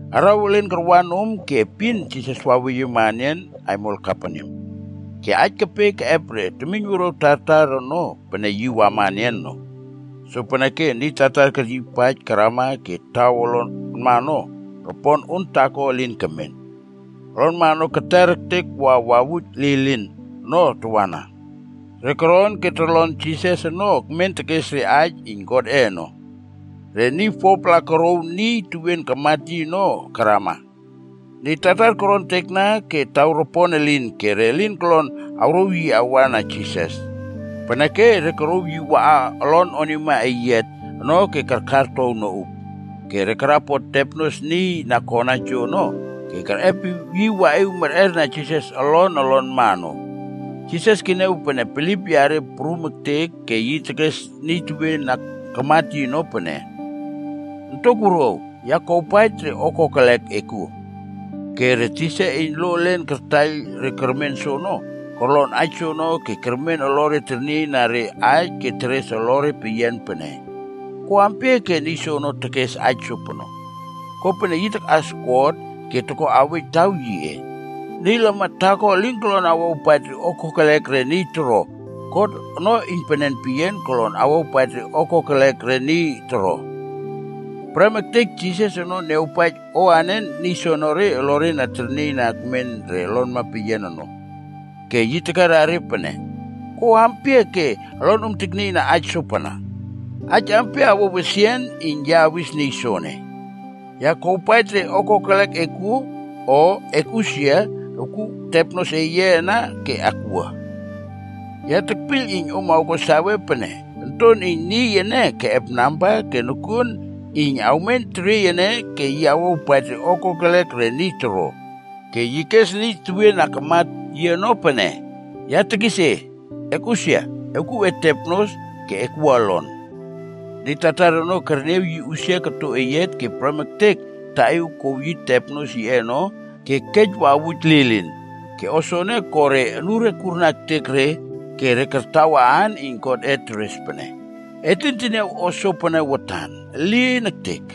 Araw elen karwa nom ke epin Jisas waweyiema enian aimol Kaperneam. Ke aij kepe keꞌep re temiyn wuruaw tartar ono pene yi wama enian no. Sopeneke niy tartar keryiypaij karama ke taw olonma ono, ropon on taako elin kemen. Olonma ono keter ektek wa wawuj lilin ono tawana. Re koron ke torlon Jisas ono ekmen tekes re aij iyn Godꞌe ono. Ke niy foapla korouw niy tewien kamat yi ono karama. Niy tartar korontekna ke taw ropon elin ke re lin korlon awrouw yi awa na Jisas. Peneke re korouw yi waꞌa olon onima eyiat ono ke karkartow noꞌup. Ke re karapot tepnos niy na kona joono, ke kerꞌepiw yi waꞌiw merꞌerna Jisas olon olonma ono. Jisas keniaw pene bilip yare prum ektek ke yi tekes niy tewien na kamat yi ono pene, “Ontok wuruaw, ya kuawpaij re o kokelek e kuo.” Ke re tisa iyn lo elen kartaiyl re kermen soono, korlon aij soono ke kermen olore ternieiyna re aij ke teres olore peyian pene, “Ko ampia ke niy soono tekes aij sopono? Kopene yi takꞌas God ke toko awej taw yiꞌe. Niy lamat taako elin kolon awawpaij re o kokelek re niy toro, God ono iynpenen peyian kolon awawpaij re o kokelek re niy toro.” Prem ektek Jisas ono niawpaij o anen niy soenere olore na ternieiyna akmen re olonma peyian ono, ke yi tekera re pene, “Ko ampia ke olonom teknieiyna aij sopana? Aij ampia awo wesian iyn ya awis niy soene? ‘Ya kuawpaij re o kokelek e kuo,’ o ‘Ekꞌusia, ewkuw tepnos eye ana ke ekwua?’ Ya tekpiyl iyn om awko sawe pene Onton iyn Niy ene keꞌep namba ke nokuon iyn yi awmen teriey ene ke yi awawpaij re o kokelek re niy toro.” Ke yi kes niy tewien na kamat yi ono pene, “Ya tekis e, ekꞌusia, ewkuw e tepnos, ke ekwua olon.” Niy tartar ono kerniaw yi usia koto eyiat ke prem ektek yi taꞌiw ke kouw yi tepnos yiꞌe ono ke kej wawuj lilin. Ke o soene ko re onure kurna ektek re ke re kartawa aan iyn God teres pene, “Et lin teniaw o sopene watan. Elin ektek!”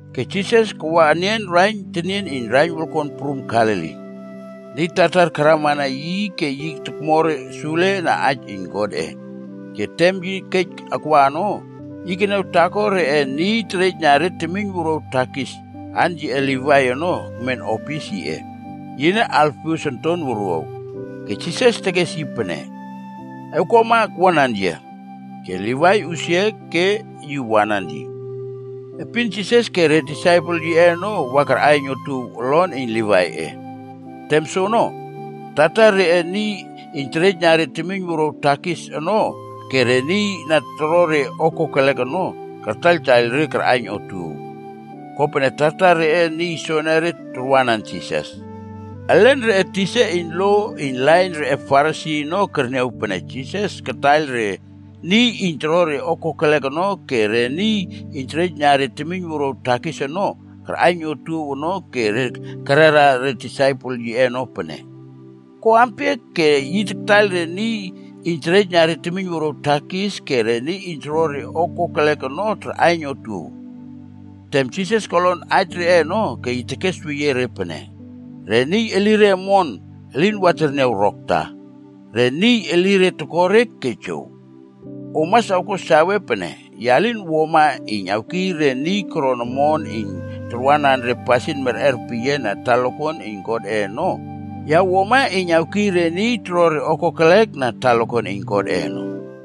Ke Jisas kawa enian raiyn tenien iyn raiyn wolkon prum Galili. Niy tartar karamana yi ke yi tokmo re sule na aij iyn Godꞌe. Ke tem yi kej akwa ono, yi keniaw taako reꞌe niy iyn terejna re temiyn wuruaw takis, aan yiꞌe Livaia ono ekmen opis yiꞌe. Yine Alfius onton wuruaw. Ke Jisas tekes yi pene, “Ewkuama ekwuanan yia.” Ke Livai usia ke yi wanan yi. Epin, Jisas ke re disaipel yiꞌe onob wa karꞌaiyn otuow olon iyn Livaiꞌe. Tem soono, tartar reꞌe niy iyn terejna re temiyn wuruaw takis ono ke re niy na toro re o kokelek ono, kartaiyltaiyl re karꞌaiyn otuow. Kopene tartar reꞌe niy soenere tarwanan Jisas. Elen reꞌe tisa iyn lo iyn lain reꞌe Farisi ono kerniaw pene Jisas kataiyl re niy iyn toro re o kokelek ono ke re niy iyn terejna re temiyn wuruaw takis ono, karꞌaiyn otuow ono ke re kerera re disaipel yiꞌe ono pene, “Ko ampia ke yi taktaiyl re niy iyn terejna re temiynwuruaw takis ke re niy iyn toro re o kokelek ono tarꞌaiyn otuow?” Tem Jisas kolon aij reꞌe ono ke yi tekesweyie re pene, “Re niy elire omon ono, elin wa terniaw rokta. Re niy elire toko re ono, ke jow. Om mas awko sawe pene, ya lin wuama iyn awkiy re niy koron omon iyn tarwanan re pasin merꞌer peyian na talakuan iyn Godꞌe ono, ya wuama iyn awkiy re niy toro re o kokelek na talakuan iyn Godꞌe ono.”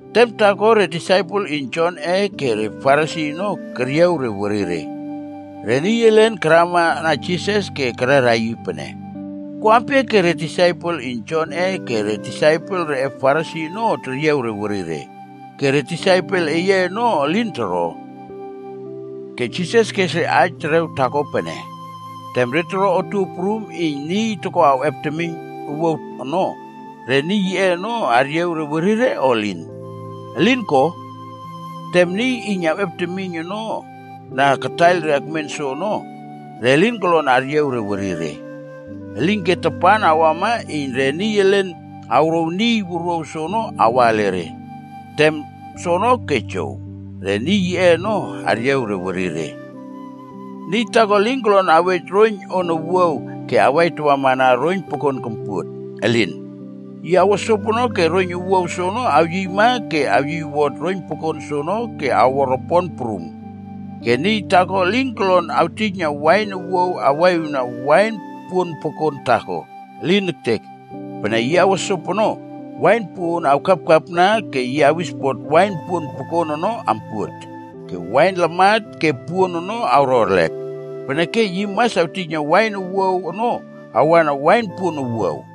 Tem taako re disaipel iyn Jonꞌe ke re Farisi ono keryiaw re werire. Re niy elen karamana Jisas ke kererna yi pene, “Ko ampia ke re disaipel iyn Jonꞌe ke re disaipel reꞌe Farisi ono teryiaw re werire, ke re disaipel eye ono elin toro tojopono?” Ke Jisas kes re aij terew taako pene, “Tem re toro otuow prum iyn niy toko awꞌep temiyn owuaw ono, re niy yiꞌe ono aryiaw re werire o elin? Elin ko! Tem niy iyn awꞌep temiyn ono na kataiyl re akmen soono, re lin kolon aryiaw re werire. Elinke tapan awama iyn re niy elen awrouw niy wuruaw soono awa ele re. Tem soono ke jow, re niy yiꞌe ono aryiaw re werire.” “Niy taako elin kolon awej roiyn on owuaw ke yi awaitawamana roiyn pokon kompuot. Elin! Yi awo sopono ke roiyn owuaw soono awyiyma ke yi awyiywot roiyn pokon soono ke awo ropon prum. Ke niy taako elin kolon awtijna wain owuaw awaꞌiwna wain puon pokon taako. Elin ektek! Pene yi awo sopono, wain puꞌuon awkapkapna ke yi awispot wain puon pokon ono ampuot. Ke wain lamat ke puon ono awro erlek. Peneke yi mas awtijna wain owuaw ono awana wain puon owuaw.”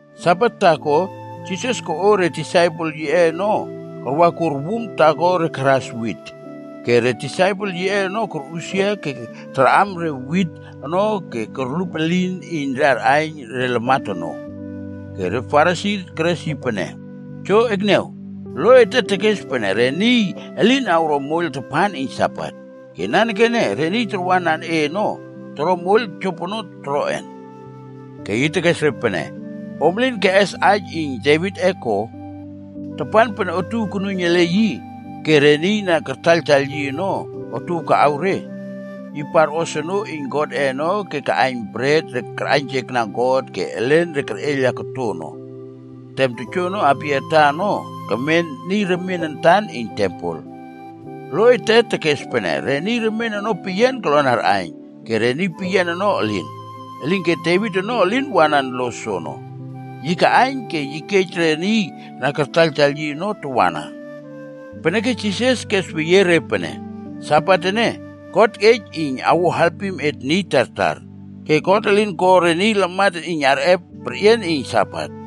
Sabat taako, Jisas koꞌo re disaipel yiꞌe ono karwakur wum taako re karas re wit. Ke re disaipel yiꞌe ono korꞌusia ke tarꞌam re wit ono ke korlup elin iyn re arꞌaiyn re lamat ono. Ke re Farisi keres yi pene, “Jo ekniaw, lo ete tekes pene re niy elin awro moiyl tapan iyn Sabat. Ke nanekene re niy tarwanan e ono, toro moiyl jopono toroꞌen?” Ke yi tekes re pene, “Om elin keꞌes aij iyn Devitꞌe ko? Tapan pene otuow konuiyn ele yi ke re niy na kartaiyltaiyl yi ono otuow kaꞌaw re, yi parꞌos onoo iyn Godꞌe ono ke kaꞌaiyn bret re karꞌaiynjekna God ke elen re kerꞌeiyla koto ono. Tem joono Abiatar ono, kemen niy remien antan iyn tempel. Lo ete tekes pene re niy remien ono peyian kolon arꞌaiyn ke re niy peyian ono elin. Elinke Devit ono elin wanan lo soono. Yi kaꞌaiyn ke yi kej re niy na kartaiyltaiyl yi ono tawana.” Peneke Jisas kesweyie re pene, “Sabat ene, God kej iyn awo alpim et niy tartar. Ke God elin ko re niy lamat ene, iyn re arꞌep perꞌian na Sabat ene.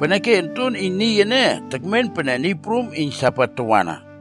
Peneke Onton iyn Niy ene tekmen pene Niy Prum iyn Sabat tawana.”